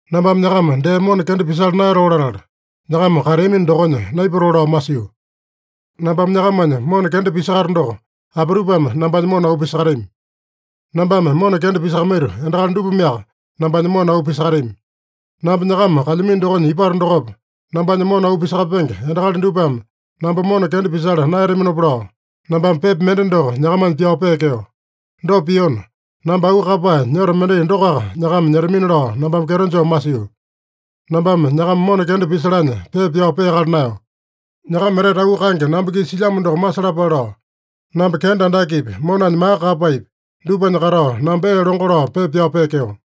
Nambame nyakama dee mona kenda pisala naeyatoo latala, nyakama kateamino dokonya naipatoo lao masio. Nambame nyakamanya mona kenda pisakato doko, apitupame nambanya mona auu pisakatami? Nambame mona kenda pisakamaito endakali dupameaka nambanya mona auu pisakatami. Namba nyakama kalyamino dokonya ipato dokopa, nambanya mona auu pisakapenge endakali dupame namba mona kenda pisala naeyataminopa lao, nambame pepa mende doko nyakamanya pyao peekeo. Dopa piona, namba auu kaeyapae nyoto mendai dokoaka nyakama nyetamina lao nambame kyeto joo masio. Nambame nyakama mona kenda pisalanya pepa pyao peakala naeyo. Nyakama etete auu kaenge namba-kisa silyamo doko masalapale lao, namba kenda andakepi, monanya maka kaeyapaepi, dupanya katao, namba ee longo lao, pepa pyao peekeo.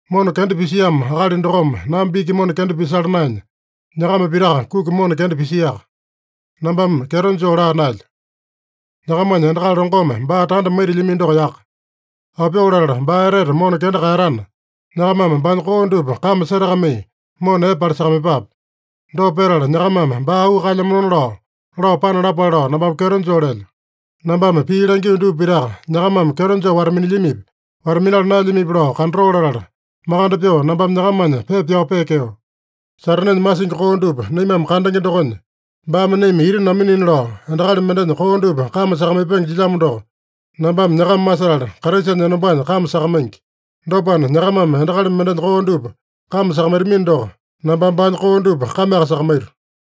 Mona kenda pisiamo akali dokome namba iki mona kenda pisala naenya, nyakama pitaka kuki mona kenda pisiaka. (Nambame kyeto joo laa naelyo.) Nyakamanya endakali longome baa tanda maitilyamino doko yaka. Aopyoo latala baa etete mona kenda kaeyatana, nyakamame baanya koo dupa kame setakamai mona epe palisakamaiyepape. Dopa petala nyakamame baa auu kaelyamanona lao, lao panalapale lao nambame kyeto joo lelyo. Nambame pii langio dupa pitaka nyakamame kyeto joo wata-minilyamipi, wata-minala naelyamipi lao kandatoo latala, makande pyoo nambame nyakamanya pepa pyao peekeo. Satanenya masingi koo dupa naimame kandenge dokonya, baame naima ita naminina lao, endakali mendenya koo dupa kame sakamaipenge jilyamo doko, nambame nyakama masetala, Kraisanya enombanya kame sakamaingi. Dopana, nyakamame endakali mendenya koo dupa kame sakamaitamino doko, nambame baanya koo dupa kameaka sakamaito.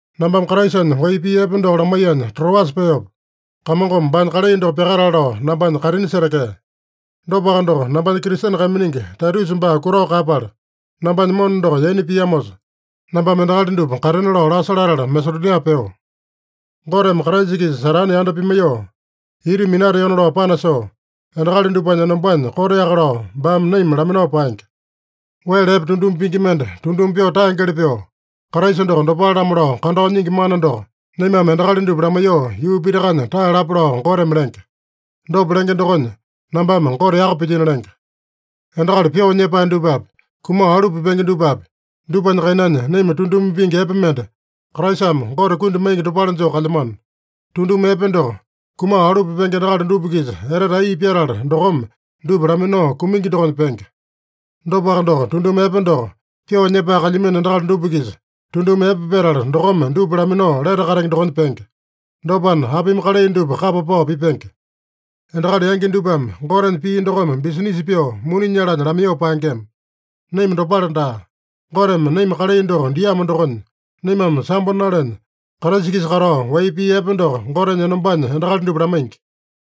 Nambame Kraisanya wai pii epe doko lamaiyanya Troasa peopa, Kamongome baanya kalai doko pyakatale lao nambanya kaitini setekea. Dopaka doko, nambanya Kristene kaiminingi Taitusa baa kutao kaeyapala, nambanya mona doko yaina piamosa, nambame endakali dupa katena lao lasa latala Masedonia peo. Goteme Kraisa-kisa Satane yanda pimaiyoo ita minateona lao panasoo, endakali dupanya enombanya koteaka lao baame naima laminao paenge. Wele epe tunduma pingi mende tunduma pyoo taengeli pyoo, Kraisa doko dopale-lamo lao kandao nyingi mana doko naimame endakali dupa lamaiyoo yuu pitakanya taeyalapa lao Goteme lenge. Dopa lenge dokonya, nambame Gote yaka pilyino lenge. Endakali pyoo nyepae dupapi, kumao alu pipenge dupapi, dupanya kainanya naima tunduma pingi epe mende, Kraisame Gote kundi maingi dopale joo kalyamano. Tunduma epe doko, kumao alu pipenge endakali dupa-kisa etete ai pyatala dokome, dupa laminao kumingi dokonya penge. Dopaka doko, tunduma epe doko, pyoo nyepae kalyamino endakali dupa-kisa tunduma epe petala dokome, dupa laminao lete katenge dokonya penge. Dopana, apimi kalai dupa kapa pao pipenge? Endakali yangi dupame Gotenya pii dokome bisinisa pyoo muni nyalanya lamaiyoo paengema. Naima dopale daa. Goteme naima kalai doko diamo dokonya, naimame sambo nalenya, Kraisa-kisa katao wai pii epe doko Gotenya enombanya endakali dupa lamaingi.